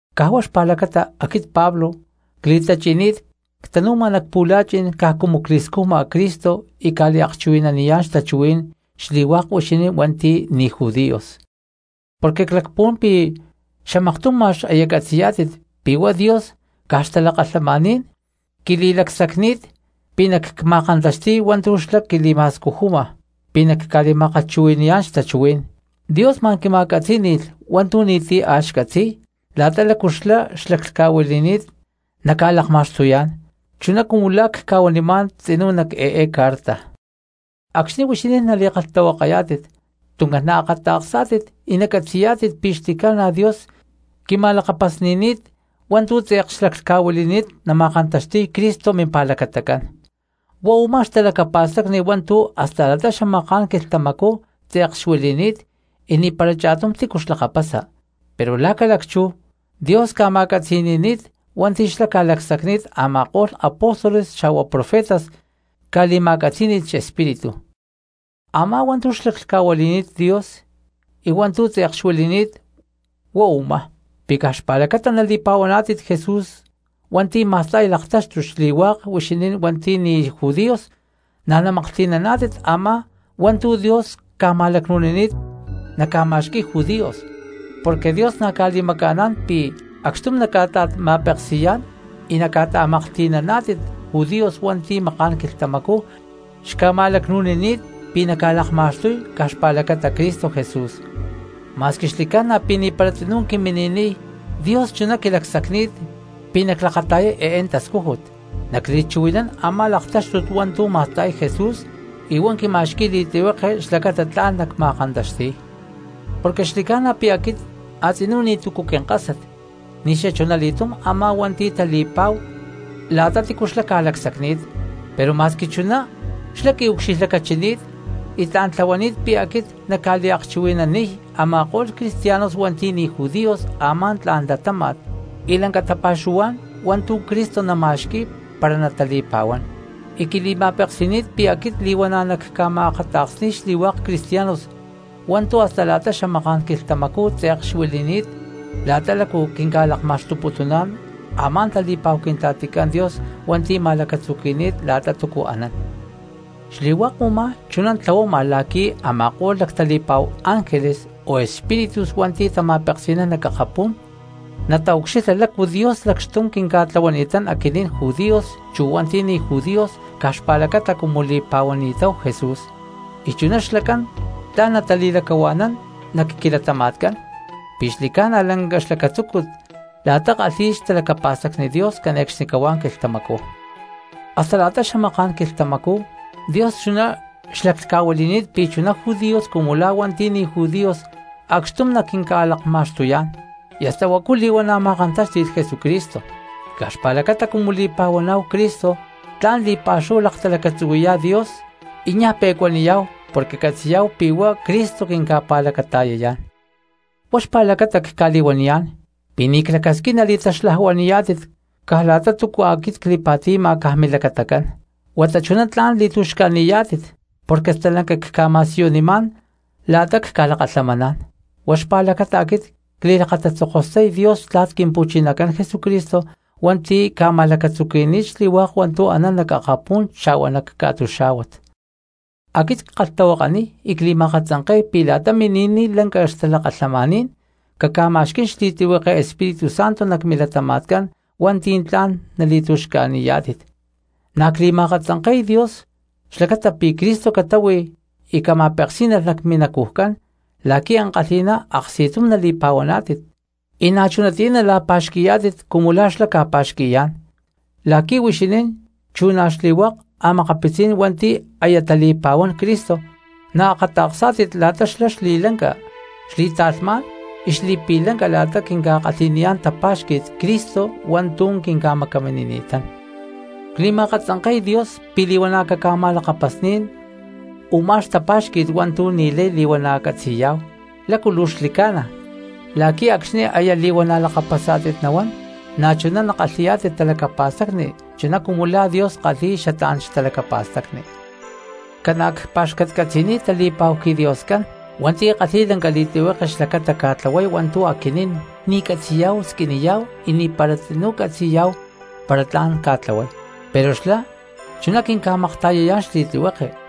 Caj huá xpa̠lacata aquit Pablo cli̠tachi̠ni̠t ctanu̠ma nac pu̠la̠chi̠n caj cumu cli̠scujma Cristo y cca̠liakchuhui̠naniyá̠n xtachuhuí̠n xli̠hua̠k huixinín hua̠nti̠ ni̠ judíos. Porque clacpuhuán pi̠ xamaktum ma̠x aya catzi̠yá̠tit pi̠ huá Dios caj xtalakalhamaní̠n quili̠lacsacni̠t pi̠ nacma̠kantaxti̠y hua̠ntu̠ xlá quili̠ma̠scujuma pi̠ nacca̠li̠ma̠kalhchuhui̠ni̠yá̠n xtachuhuí̠n. Dios ma̠n quima̠catzí̠ni̠lh hua̠ntu̠ ni̠ti̠ a̠ xcatzi̠y la̠ta lácu xlá laclhca̠huili̠ni̠t naca̠lakma̠xtuyá̠n, chuná cumu la̠ cca̠huanimá̠n tzinú nac eé carta. Acxni̠ huixinín nali̠kalhtahuakayá̠tit tuncán naakata̠ksá̠tit y nacatzi̠yá̠tit pi̠ xli̠ca̠na Dios quima̠lakapasni̠ni̠t hua̠ntu̠ tze̠k xlaclhca̠huili̠ni̠t nama̠kantaxti̠y Cristo mimpa̠lacatacán. Huá u̠má xtalacapa̠stacni hua̠ntu̠ hasta la̠ta xamaká̠n quilhtamacú tze̠k xuili̠ni̠t y ni̠para cha̠tum tícu xlakapasa, pero la̠ ca̠lacchú Dios ca̠ma̠catzi̠ni̠ni̠t hua̠nti̠ xlá ca̠lacsacni̠t a̠ma̠ko̠lh apóstoles xa̠hua profetas ca̠li̠ma̠catzí̠ni̠lh xespíritu. Amá hua̠ntu̠ xlaclhca̠huili̠ni̠t Dios y hua̠ntu̠ tze̠k xuili̠ni̠t huá u̠má: pi̠ caj xpa̠lacata nali̠pa̠huaná̠tit Jesús hua̠nti̠ ma̠sta̠y laktáxtut xli̠hua̠k huixinín hua̠nti̠ ni̠ judíos na̠ namaklhti̠naná̠tit a̠má hua̠ntu̠ Dios ca̠ma̠lacnu̠nini̠t naca̠ma̠xqui̠y judíos. Porque Dios na̠ ca̠li̠maca̠ná̠n pi̠ acxtum naca̠ta̠ma̠peksi̠yá̠n y naca̠ta̠maklhti̠naná̠tit judíos hua̠nti̠ maká̠n quilhtamacú xca̠ma̠lacnu̠nini̠t pi̠ naca̠lakma̠xtuy caj xpa̠lacata Cristo Jesús. Ma̠squi xli̠ca̠na pi̠ ni̠para tzinú quimini̠niy, Dios chuná quili̠lacsacni̠t pi̠ naclakata̠yay eé tascújut nacliakchuhui̠nán a̠má laktáxtut hua̠ntu̠ ma̠sta̠y Jesús, y huá quima̠xqui̠y li̠tlihueke xlacata tla̠n nacma̠kantaxti̠y. Porque xli̠ca̠na pi̠ aquit a̠tzinú ni̠tu̠cu quinkásat ni̠xachunali̠túm a̠má hua̠nti̠ tali̠pa̠hu la̠ta tícu xlá ca̠lacsacni̠t. Pero ma̠squi chuná xlá quiucxilhlacachini̠t y tla̠n tlahuani̠t pi̠ aquit nacca̠liakchuhui̠naniy a̠ma̠ko̠lh cristianos hua̠nti̠ ni̠ judíos a̠má tla̠n latáma̠t y lanca tapa̠xuhuá̠n hua̠ntu̠ Cristo nama̠xqui̠y para natali̠pa̠huán. Y quili̠ma̠peksi̠ni̠t pi̠ aquit li̠huana̠ nacca̠ma̠akata̠ksni̠y xli̠hua̠k cristianos hua̠ntu̠ hasta la̠ta xamaká̠n quilhtamacú tze̠k xuili̠ni̠t la̠ta la̠cu quinca̠lakma̠xtuputuná̠n a̠má tali̠pa̠hu Quintla̠ticán Dios hua̠nti̠ ma̠lacatzuqui̠ni̠t la̠ta túcu anán. Xli̠hua̠k u̠má chuná tlahuama la̠qui̠ a̠ma̠ko̠lh lactali̠pa̠hu ángeles o espíritus hua̠nti̠ tama̠peksi̠nán nac akapú̠n nataucxilha lácu Dios lacxtum quinca̠tlahuani̠tán aquinín judíos chu hua̠nti̠ ni̠ judíos caj xpa̠lacata cumu li̠pa̠huani̠táhu Jesús, y chuná xlacán tla̠n natali̠lacahua̠nán nac quilatama̠tcán pi̠ xli̠ca̠na lanca xlacatzúcut la̠ta kalhi̠y xtalacapa̠stacni Dios cane̠cxnicahuá quilhtamacú. Hasta la̠ta xamaká̠n quilhtamacú Dios chuná xlaclhca̠huili̠ni̠t pi̠ chuná judíos cumu la̠ hua̠nti̠ ni̠ judíos acxtum naquinca̠lakma̠xtuyá̠n, y hasta huacu li̠huana̠ ma̠kantáxti̠lh Jesucristo. Y caj xpa̠lacata cumu li̠pa̠huaná̠hu Cristo tla̠n li̠pa̠xúhu laktalacatzuhuí̠yá̠hu Dios y niaj pe̠cuaniyá̠hu porque catzi̠yá̠hu pi̠ huá Cristo quinca̠pa̠lacata̠yayá̠n. Huá xpa̠lacata cca̠li̠huaniyá̠n pi̠ ni̠ clacasquín nali̠taxlajuani̠yá̠tit caj la̠ta túcua aquit cli̠pa̠ti̠ma caj milacatacán, huata chuná tla̠n li̠tu̠xca̠ni̠yá̠tit porque stalanca cca̠ma̠siyunimá̠n la̠ta cca̠lakalhamaná̠n. Huá xpa̠lacata aquit cli̠lakatatzokostay Dios xtla̠t Quimpu̠chinacán Jesucristo, hua̠nti̠ ca̠ma̠lacatzuqui̠ni̠t xli̠hua̠k hua̠ntu̠ anán nac akapú̠n xa̠hua nac ca̠tuxá̠huat. Aquit ckalhtahuakaniy y cli̠ma̠akatzanke̠y pi̠ la̠ta mini̠niy lanca xtalakalhamaní̠n caca̠ma̠xquí̠n xli̠tlihueke Espíritu Santo nac milatama̠tcán hua̠nti̠ tla̠n nali̠tu̠xca̠ni̠yá̠tit. Na̠ cli̠ma̠akatzanke̠y Dios xlacata pi̠ Cristo catáhui y huá cama̠peksí̠nalh nac minacujcán la̠qui̠ ankalhi̠ná aksti̠tum nali̠pa̠huaná̠tit, y na̠chunatiyá nala̠pa̠xqui̠yá̠tit cumu la̠ xlá ca̠pa̠xqui̠yá̠n, la̠qui̠ huixinín chu na̠ xli̠hua̠k a̠makapitzí̠n hua̠nti̠ aya tali̠pa̠huán Cristo naakata̠ksá̠tit la̠ta xlá xli̠lanca, xli̠ta̠lhmá̠n y xli̠pi̠lanca la̠ta quinca̠kalhi̠niyá̠n tapa̠xqui̠t Cristo hua̠ntu̠ quinca̠macaminini̠tán. Cli̠ma̠akatzanke̠y Dios pi̠ li̠huana̠ caca̠ma̠lakapasní̠n u̠má xtapá̠xqui̠t hua̠ntu̠ ni̠lay li̠huana̠ catzi̠yá̠hu lácu luu xli̠lanca la̠qui̠ acxni̠ aya li̠huana̠ lakapasá̠tit nahuán na̠chuná nakalhi̠yá̠tit talacapa̠stacni chuná cumu la̠ Dios kalhi̠y xatlá̠n xtalacapa̠stacni. Ca̠na cpa̠xcatcatzi̠niy tali̠pa̠hu quiDioscán hua̠nti̠ kalhi̠y lanca li̠tlihueke xlacata ca̠tlahuay hua̠ntu̠ aquinín ni̠ catzi̠yá̠hu squiniyá̠hu y ni̠para tzinú catzi̠yá̠hu para tla̠n ca̠tlahuay, pero xlá chuná quinca̠makta̠yayá̠n xli̠tlihueke.